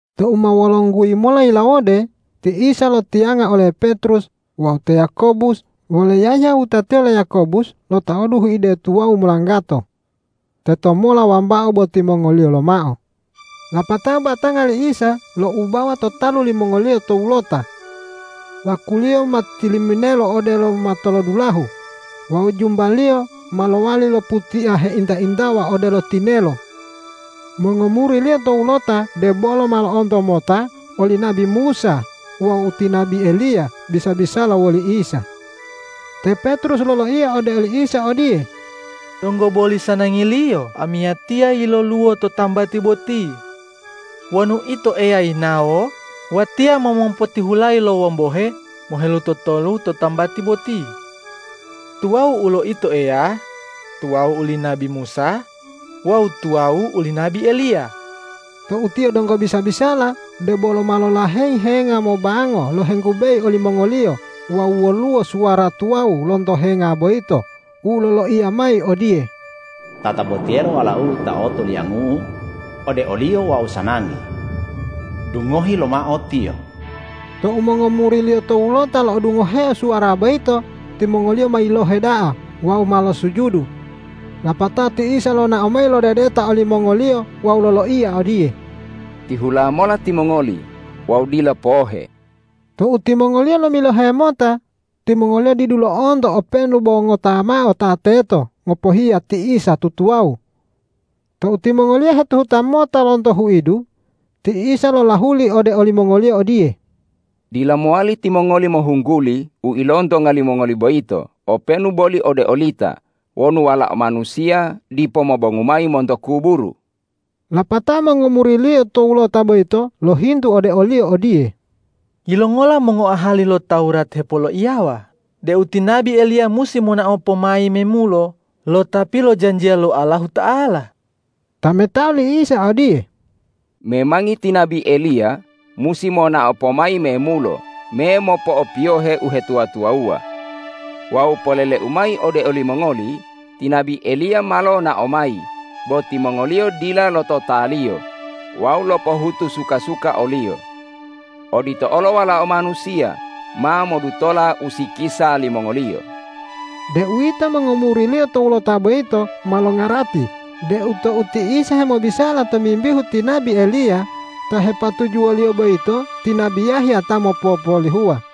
Tou ma wolongguyi mola yilawode ti Isa lotiyanga ole Petrus wawu te Yakobus wole Yahya wutatiyo le Yakobus lotaodu huide tuwawu molanggato. Tetomola wambao bo timongoliyo lomao. Lapatao batanga li Isa loubawa to talu limongoliyo towulota. Laku-Liyo ma tiliminelo odelo matolodulahu wawu jumba-Liyo ma lowali loputia heinta-intawa odelo tinelo. Mongomuri-Liyo towulota debolo ma lo'onto mota oli nabi Musa wawu ti nabi Eliya bisa-bisala woli Isa. Te Petrus loloiya ode oli Isa odiye,”Donggo boli sanangiliyo amiyatiya yiloluwo to tambati boti. Wonu Ito Eya yinawo, watiya ma mopotihulayi lo wombohe mohelutotolu to tambati boti. Tuwawu ulo Ito Eya, tuwawu uli nabi Musa wawu tuwawu uli nabi Eliya.” Tou tiyo donggo bisa-bisala, debolo ma lolaheyi henga mobango lohenggubeyi olimongoliyo wawu woluwo suwara tuwawu lonto henga boyito u loloiya mayi odiye,”Tatabotiyelo Walau-U ta otoliangu-U, ode o-Liyo Wau sanangi. Dungohi lomao Tiyo!” Tou mongomuri-Liyo towulota lo'odungoheo suwara boyito, timongoliyo ma yilohe da'a wawu ma losujudu. Lapatao ti Isa lonao mayi lodedeta olimongoliyo wawu loloiya odiye,”Tihula mola timongoli wawu dila pohe!” Tou timongoliyo lomilohe mota, timongoliyo didu lo'onto openu bo ngota mao ta teto ngopohiya ti Isa tutuwawu. Tou timongoliyo hetuhuta mota lonto huidu, ti Isa lolahuli ode olimongoliyo odiye,”Dila mowali timongoli mohungguli u ilontonga limongoli boyito openu boli ode olita wonu Walao Manusiya dipo mobongu mayi monto kuburu.” Lapatao mongomuri-Liyo towulota boyito lohintu ode o-Liyo odiye,”Yilongola mongoahali lo Tawurat hepoloiyawa deu ti nabi Eliya musi monao pomayi memulo lo Ta pilojanjiya lo Allahuta'ala?” Tametao li Isa odiye,”Memangi ti nabi Eliya musi monao pomayi memulo me mopo'opiyohe uhetuwa-tuwawuwa. Wawu polele-U mayi ode olimongoli: Ti nabi Eliya ma lonao mayi, bo timongoliyo dila lototaliyo wawu lopohutu suka-suka oliyo. Odito olo Walao Manusiya ma modutola usikisa limongoliyo.” Deuwito mongomuri-Liyo towulota boyito ma longarati deu tou ti Isa hemobisala tomimbihu ti nabi Eliya, ta hepatujuwo-Liyo boyito ti nabi Yahya ta mopopolihuwa.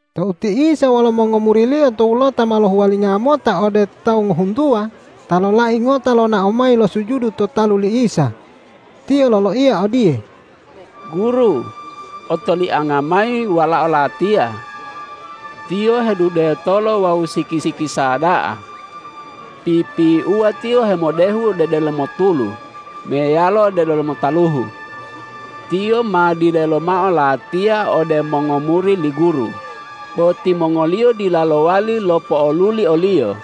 Tou ti Isa wolo mongomuri-Liyo towulota ma lohuwalinga mota ode tawu ngohuntuwa, ta lolai ngota lonao mayi losujudu to talu li Isa. Tiyo loloiya odiye,”Guru, otolianga mayi walao latiya. Tiyo hedudetolo wawu siki-sikisa da'a. Pipiuwa tiyo hemodehu ode delomo tulu meyalo ode delomo taluhu. Tiyo ma dilelo mao latiya ode mongomuri li Guru, bo timongoliyo dila lowali lopo'oluli oliyo.”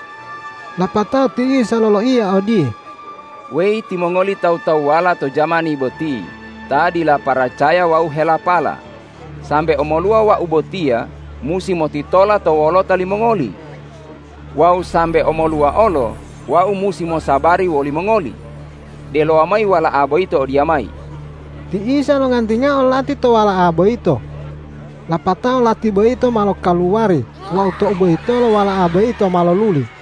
Lapatao ti Isa loloiya odiye,”Weyi timongoli tawu-tawuwala to jamani boti ta dila paracaya wawu helapala, sambe omoluwa Wau botiya musi motitola to wolota limongoli? Wawu sambe omoluwa olo Wau musi mosabari woli mongoli? Delowa mayi wala'a boyito odiyamayi.” Ti Isa longantingao lati to wala'a boyito. Lapatao lati boyito ma lokaluwari wawu tou boyitolo wala'a boyito ma loluli.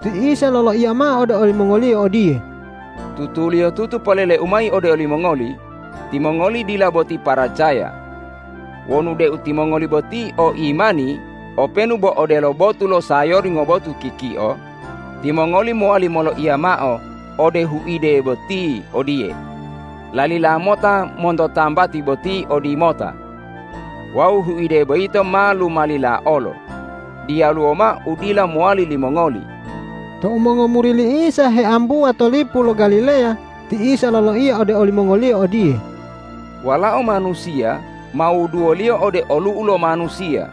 Ti Isa loloiya mao ode olimongoliyo odiye,”Tutuliyotutu polele-U mayi ode olimongoli: Timongoli dila boti paracaya. Wonu deu timongoli boti o imani openu bo odelo botu lo sayori ngobotu kikio, timongoli mowali moloiya mao ode huide boti odiye: Lalila mota monto tambati boti odimota! Wawu huide boyito ma lumalila olo. Diyaluwo mao u dila mowali limongoli.” Tou mongomuri li Isa heambuwa to lipu lo Galileya, ti Isa loloiya ode olimongoliyo odiye,”Walao Manusiya ma wuduwoliyo ode olu'u lo manusiya.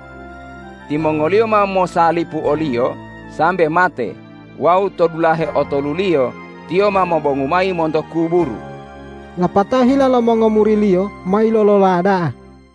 Timongoliyo ma mosalipu o-Liyo sambe mate wawu to dulahe otoluliyo Tiyo ma mobongu mayi monto kuburu.” Lapatao hila lo mongomuri-Liyo ma yilolola da'a.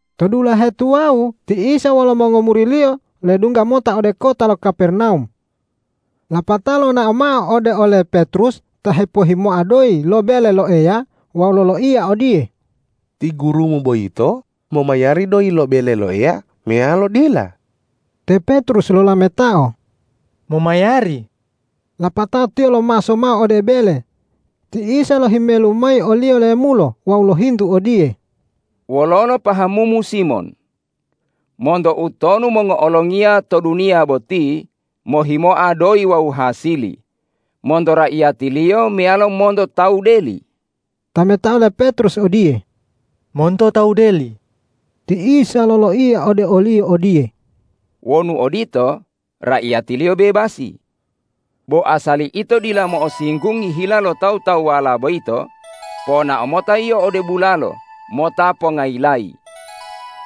To dulahe tuwawu ti Isa wolo mongomuri-Liyo ledungga mota ode kota lo Kapernawum. Lapatao lonao mao ode ole Petrus ta hepohimoa doyi lo bele lo Eya wawu loloiya odiye,”Ti Gurumu boyito momayari doyi lo bele lo Eya meyalo dila?” Te Petrus lolametao,”Momayari.” Lapatao tiyo lomaso mao ode bele. Ti Isa lohimelu mayi oliyo lemulo wawu lohintu odiye,”Wololo pahamumu Simon? Monto utonu mongo'olongiya to duniya boti mohimoa doyi wawu hasili, monto raiyatiliyo meyalo monto tawu deli?” Tametao le Petrus odiye,”Monto tawu deli!” Ti Isa loloiya ode oliyo odiye,”Wonu odito, raiyatiliyo bebasi. Bo asali ito dila mo'osinggungi hila lo tawu-tawuwala boyito, ponao mota yio ode bulalo mota pongayilayi.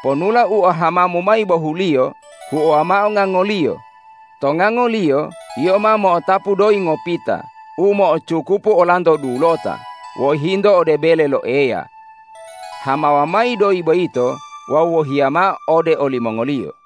Ponula u ohamamu mayi bohuliyo huowa mao ngangoliyo. To ngangoliyo yio ma mo'otapu doyi ngopita u mo'ocukupu olanto dulota wohinto ode bele lo Eya. Hamawa mayi doyi boyito wawu wohiya mao ode olimongoliyo.”